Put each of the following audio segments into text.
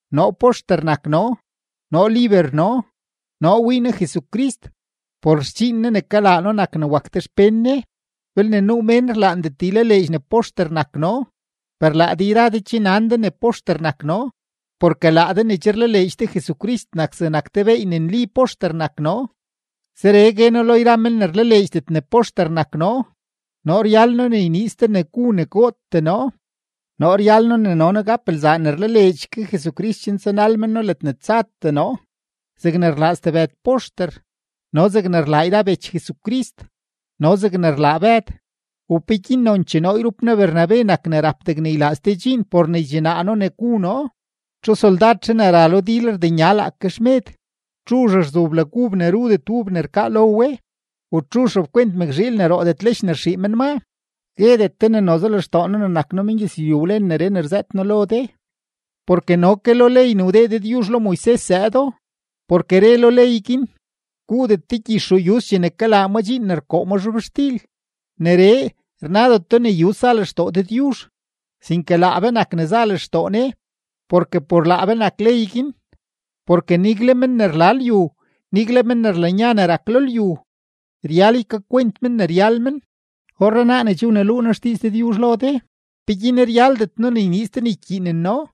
Noo poxter nak noo; noo liber noo; noo wii noo Jesucrist; por xdxiin Ne ne kalaa noo nak ne wak de xpén Ne. Belne nuu mén rlaandet ylaleedx ne poxter nak noo, per laa de yra de che nan de ne poxter nak noo, porke laa de ne che rlaleedx de Jesucrist nak zegnak te beey ne nli poxter nak noo. Zeree gue noo lo yra men ne rlaleedxdet ne poxter nak noo: Noo ryal noo ne yniiz de ne gu ne gootee noo. Noo ryal noo ne no noo gap lzaa ne rlaleedx ke Jesucrist chen tsanal men noo ledne tsatee noo zegne rlaa stebëd poxter, no zegne rlaa yra bech Jesucrist, no zegne rlaa Bëd. ¿U peguin nonchee noo yrup noo Bernabe nak ne rap degne ylaa ste dxiin por ne ydxinaa noo ne gu noo? ¿Txu soldadzhe ne ra lo dil rdenya laake xmed? ¿Txuzh rzu blag ub ne rudet ub ne rkaa lo we? ¿U txuzh rapkwent mëkzhiil ne roodet lech ne rxii men maa? Guedet de ne noze lextoo noo ne nak noo mengyëzlyu wlen neree ne rzëët noo lo de, porke no ke lo ley ne wdee Dëdyuzh lo Moises zëëdo. Porke re lo ley guin: “Guudet de gyix ruu yuz chene kalaa ma dxiin ne rkoo ma zhobxtil.” Neree, rnadeto ne yuz za lextoo Dëdyuzh, sinke laa be nak ne za lextoo Ne. Porke por laa be nak ley guin. Porke nigle men ne rla lyu, nigle men ne rlanya ne rak lo lyu, ryal ykakwent men ne ryal men. Orrenaa ne che wneluu noo xdiiz Dëdyuzh lo de, ¿peguin ryaldet noo ne yniiz de ne ykyiinen noo?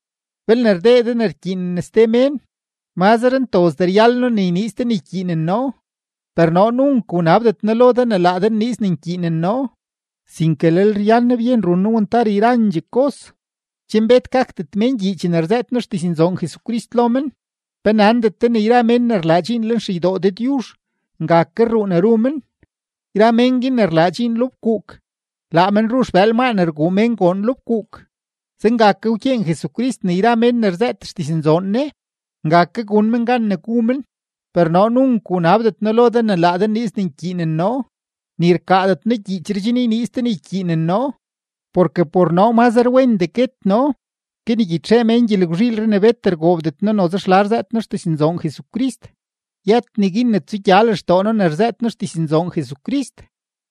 Belne rdee de ne rkyiinen ste mén, mazre ntozdee ryal noo ne yniiz de ne ykyiinen noo. Per noo nunk wnabdet noo lo de ne laa de nniiz ne nkyiinen noo, sinke lel ryan noo byen run noo wantar yrandxee kos, chen bet gakdet mén gyii chene rzëët noo xdiznzoon Jesucrist lo men. ¿Pe nandet de ne yra mén ne rlaa dxiin lenxeydoo Dëdyuzh, nga ke rruu ne ru men? Yra mén guin ne rlaa dxiin lo fkuuk, laa men ru xbëël maa ne rguu mén goon lo fkuuk. Zenga ke wkyeen Jesucrist ne yra men ne rzëët xdiznzoon Ne, nga ke gun men gan ne gu men. Per noo nunk wnabdet noo lo de ne laa de nniiz ne nkyiinen noo, ni rkaadet noo gyiichree chen yniiz de ne ykyiinen noo, porke por noo mazre wendee guet noo ke ne ygyitxee mén gyelgwzhiilree ne bet rgoobdet noo noze xla rzëët noo xdiznzoon Jesucrist. Yët neguin ne tsugya lextoo noo ne rzëët noo xdiznzoon Jesucrist,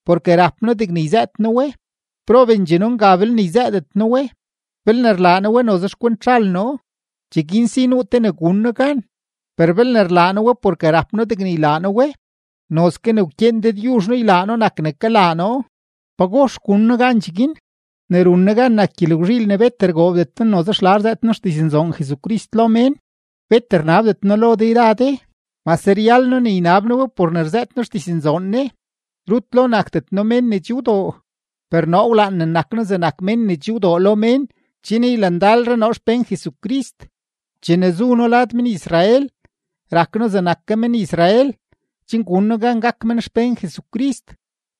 porke rap noo degne yzëët noo we. ¡Probendxee noo nga belne yzëëdet noo we! Belne rlaa noo we noze xkwent zhal noo, cheguin si nuu te ne gun noo gan; per belne rlaa noo we porke rap noo degne ylaa noo we, nozke ne wkyeen Dëdyuzh noo ylaa noo nak ne kalaa noo. ¿Pagox gun noo gan cheguin? Ne run noo gan nak gyelgwzhiil ne bet rgoobdet noo noze xla rzëët noo xdiznzoon Jesucrist lo mén; bet rnabdet noo lo de yra de, mase ryal noo ne ynab noo we por ne rzëët noo xdiznzoon Ne. Rut lo nakdet noo mén ne che wdoo, per noo wlaan ne nak noo zegnak mén ne che wdoo lo mén chen ylandalre noo xpén Jesucrist. Chene zu noo lad men-Israel, rak noo zegnak ke men-Israel chen gun noo gan gak men xpén Jesucrist.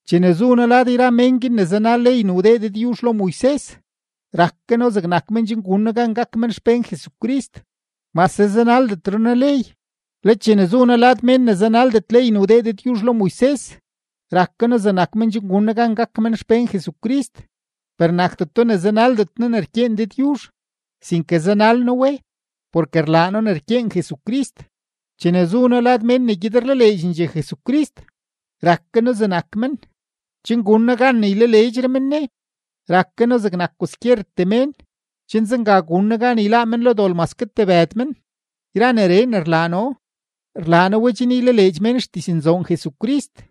Chene zu noo lad yra mén guin ne zanal ley ne wdee Dëdyuzh lo Moises, rak ke noo zegnak men chen gun noo gan gak men xpén Jesucrist, mase zanaldetre noo ley. Le chene zu noo lad mén ne zanaldet ley ne wdee Dëdyuzh lo Moises, rak ke noo zegnak men chen gun noo gan gak men xpén Jesucrist. Per nakdeto ne zanaldet noo ne rkyeen Dëdyuzh, sinke zanal noo we, porke rlaa noo ne rkyeen Jesucrist. Chene zu noo lad mén ne gyed rlaleedxendxee Jesucrist, rak ke noo zegnak men, chen gun noo gan ne ylaleedxre men Ne. Rak ke noo zegnak kwaskyertee mén, chen zenga gun noo gan yláá men lo dol maske tebëd men. Yra neree ne rlaa noo, rlaa noo we chen ylaleedx mén xdiznzoon Jesucrist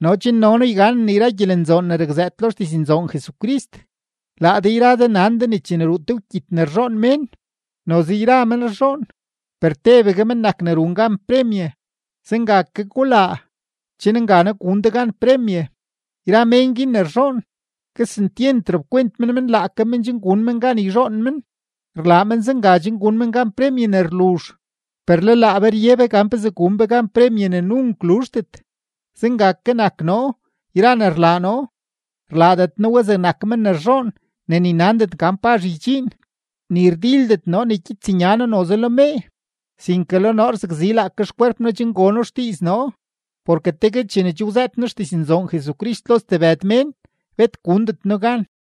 no chen no noo yganen yra gyelenzoon ne rakzëët lo xdiznzoon Jesucrist. Laa de yra de nan de ne chene ruu te wkyit ne rzhoon mén, noze yra men rzhoon, per tebegue men nak ne run gan premye. Zenga ke gulaa, chen nganaa gun de gan premye. Yra mén guin ne rzhoon, kesentyent rap kwent men men laake men chen gun men gan yzhoon men. Rlaa men zenga chen gun men gan premye ne rluzh, per le laa be rye be gan pezee gun be gan premye ne nunk luzhdet. Zenga ke nak noo, yra ne rlaa noo, rlaadet noo we zegnak men ne rzhoon ne ni nandet gan pazh ydxiin; ni rdildet noo ne kyits nya noo noze lo mee. Sinke le noo rzakzi laake xkwerp noo chen gono xdiiz noo, porke tegue chene che wzëët noo xdiznzoon Jesucrist lo stebëd mén, bet gundet noo gan.